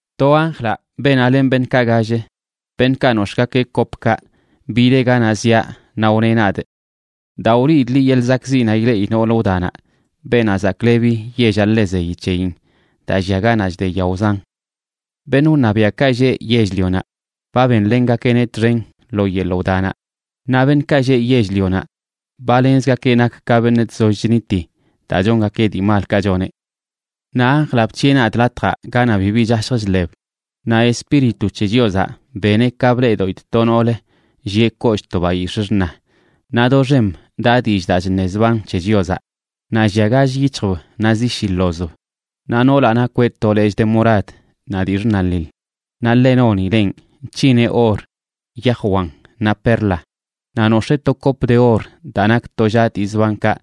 To anjlaꞌ, beenaꞌ len beṉꞌkaꞌ gall, beṉꞌkaꞌ nox̱ꞌgakeꞌ kopkaꞌ, bideꞌ ganaꞌ ziaꞌ naꞌ wneꞌ nadꞌ: ―Da, wliidꞌ liꞌ yeḻꞌ zakꞌziꞌnaꞌ ileꞌi noolə wdanaꞌ, beenaꞌ zaklebi yellaꞌ ḻe zeyi c̱heyin daa llia ganaꞌ chde yao zan. Beṉꞌ wṉabiaꞌkaꞌ lleꞌ yell-lionaꞌ ba benlengakeꞌneꞌ txen lo yeḻꞌ wdanaꞌ, naꞌ beṉꞌkaꞌ lleꞌ yell-lionaꞌ ba lenzgakeꞌ nak ka beṉꞌ chzoll chniti daa chongakeꞌ dii malkaꞌ choneꞌ. Naꞌ anjlaꞌ bc̱hiꞌe nadꞌ latjaꞌ ganaꞌ bibi chashj chḻeb naꞌ Espíritu c̱he Chiozaꞌ beneꞌ ka bleꞌdoꞌidꞌ to noolə llieꞌ kollꞌ to bayix̱ꞌ xṉa, naꞌ doxem daꞌ dillꞌ daa chṉe zban c̱he Chiozaꞌ, naꞌ llia gall yic̱hjb naꞌ zi shi ḻozb. Naꞌ noolaꞌ nakweꞌ to lechꞌ de morad naꞌ dii xṉaliḻ, naꞌ ḻe nonilenꞌ nc̱hineꞌ or, yaj wan naꞌ perla. Naꞌ nox̱ee to kop de or daa nak tollaꞌ dii zbankaꞌ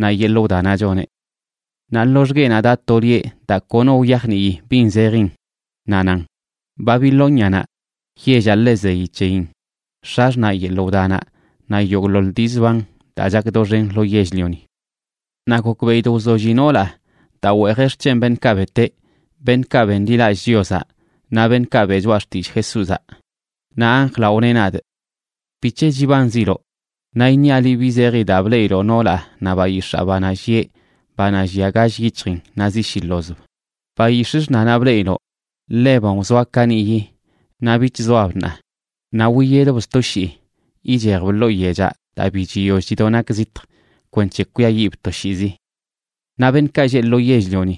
naꞌ yeḻꞌ wdanaꞌ choneꞌ. Naꞌ loxgueꞌnaꞌ daꞌ to lieꞌ daa kono wyajnii bin zejin, naꞌ nan: “Babilónianaꞌ, yellaꞌ ḻe zeyi c̱heyin, x̱axṉaꞌ yeḻꞌ wdanaꞌ naꞌ yogꞌḻoḻ dii zban daa chak doxen lo yell-lioni.” Naꞌ gokbeꞌidꞌ wzolli noolaꞌ daa weejeꞌ xc̱hen beṉꞌkaꞌ beteꞌ, beṉꞌkaꞌ benḻilallꞌ Chiozaꞌ naꞌ beṉꞌkaꞌ beꞌ choꞌa xtillꞌ Jesúzaꞌ. Naꞌ anjlaꞌ wneꞌ nadꞌ: ―¿Bic̱he chibanziloꞌ? Naꞌ iṉiaꞌ liꞌ bi zeji daa bleꞌiloꞌ noolaꞌ naꞌ bayix̱aa, banaꞌ llieꞌ, banaꞌ llia gall yic̱hjin naꞌ zi shi ḻozb. Bayix̱ꞌ xṉanaꞌ bleꞌiloꞌ, ḻeban wzoa kaniꞌyi, naꞌ bich zoab ṉaa. Naꞌ wiyedb sto shii ichejb ḻoo yechaꞌ daa bi chiyoll chido nak zitj kwenc̱he kwiayiꞌb toshiizi. Naꞌ beṉꞌkaꞌ lleꞌ lo yell-lioni,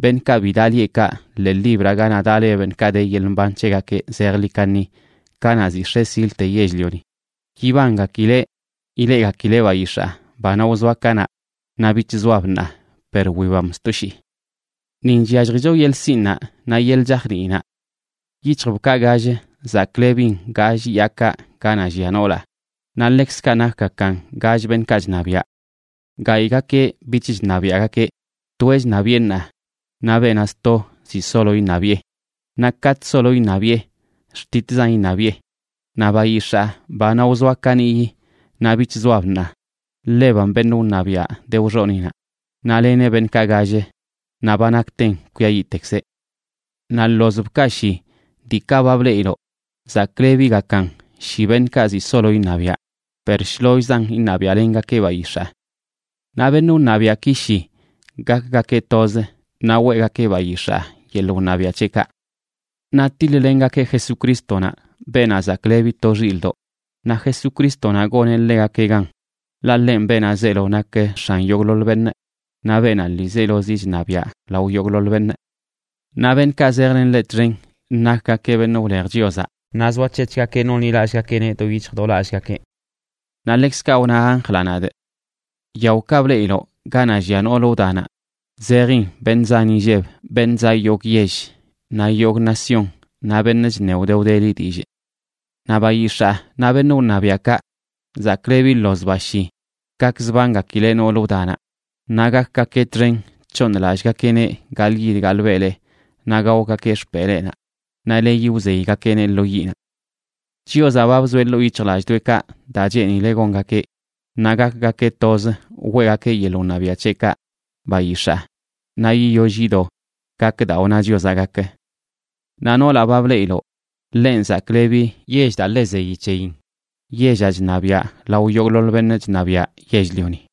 beṉꞌkaꞌ bi daꞌ lieꞌkaꞌ ḻee libraꞌ ganaꞌ daꞌ le beṉꞌkaꞌ de yeḻꞌ mban c̱hegakeꞌ zejḻi kaṉi kanaꞌ zi x̱e silte yell-lioni, yibangakileꞌ ileꞌgakileꞌ bayix̱aa, banaꞌ wzoa kanaꞌ, naꞌ bich zoab ṉaa, per wibam sto shii. ’Nin chyalljicho yeḻꞌ sinꞌnaꞌ naꞌ yeḻꞌ chajniinaꞌ. Yic̱hjbkaꞌ gall, zaklebin gall yaakaꞌ ganaꞌ llia noolaꞌ, naꞌ ḻekzkaꞌ nakgakan gall beṉꞌkaꞌ chṉabiaꞌ. Gayꞌgakeꞌ bich chṉabiaꞌgakeꞌ, toeꞌ chṉabiꞌe ṉaa, naꞌ beenaꞌ sto ziꞌ solo iṉabiꞌe. Naꞌ katꞌ solo iṉabiꞌe, xtitzan iṉabiꞌe. Naꞌ bayix̱aa, banaꞌ wzoa kaniꞌyi naꞌ bich zoab ṉaa, ḻebanꞌ beṉꞌ wṉabiaꞌ de wxoniꞌnaꞌ. Naꞌ leneꞌ beṉꞌkaꞌ gall, naꞌ ba nakten kwiayiꞌtekzeꞌ. ’Naꞌ ḻozbkaꞌ shi, diikaꞌ ba bleꞌiloꞌ, zaklebigakan shi beṉꞌkaꞌ ziꞌ solo iṉabiaꞌ, per shlollzan iṉabiaꞌlengakeꞌ bayix̱aa. Naꞌ beṉꞌ wṉabiaꞌki shi gakgakeꞌ toz, naꞌ weꞌgakeꞌ bayix̱aa yeḻꞌ wṉabiaꞌ c̱heꞌkaꞌ. Naꞌ tiḻ-lengakeꞌ Jesucrístonaꞌ, Beenaꞌ Zaklebi to Xilꞌdoꞌ, naꞌ Jesucrístonaꞌ goneꞌ ḻegakeꞌ gan, ḻaꞌ ḻenꞌ Beenaꞌ zeelo nak X̱an yogꞌḻoḻ beṉꞌ, naꞌ Beenaꞌ ḻiizelozi chṉabiaꞌ lao yogꞌḻoḻ beṉꞌ. Naꞌ beṉꞌkaꞌ zejlen ḻeꞌ txen nakgakeꞌ beṉꞌ wlej Chiozaꞌ naꞌ zoac̱hec̱hgakeꞌ nonḻilallꞌgakeꞌneꞌ do yic̱hj do lallgakeꞌ. Naꞌ ḻekzkaꞌ wna anjlaꞌ nadꞌ: ―Yaokaꞌ bleꞌiloꞌ ganaꞌ llia noolə wdanaꞌ, zejin beṉꞌ zan inlleb, beṉꞌ zaꞌ yogꞌ yell naꞌ yogꞌ nación, naꞌ beṉꞌ chṉe wde wdeli dillꞌ. Naꞌ bayix̱aa naꞌ beṉꞌ wṉabiaꞌkaꞌ zaklebi ḻozbaꞌ shi gakzbangakileꞌ nool wdanaꞌ. Naꞌ gakgakeꞌ txen c̱hooṉlallꞌgakeꞌneꞌ gaḻꞌyid gaḻꞌbelee naꞌ gaogakeꞌ xpeleenaꞌ, naꞌ leyi wzeygakeꞌneꞌ lo yiꞌnaꞌ. Chiozaꞌ ba bzoeꞌ ḻoo yic̱hjlallꞌdoꞌekaꞌ daa cheenileꞌ gongakeꞌ, naꞌ gakgakeꞌ toz weꞌgakeꞌ yeḻꞌ wṉabiaꞌ c̱heꞌkaꞌ bayix̱aa naꞌ yiyoll yido gak daa wna Chiozaꞌ gak. Naꞌ noolaꞌ ba bleꞌiloꞌ, ḻenꞌ zaklebi yell daa ḻe zeyi c̱heyin, yellaꞌ chṉabiaꞌ lao yogꞌḻoḻ beṉꞌ chṉabiaꞌ yell-lioni.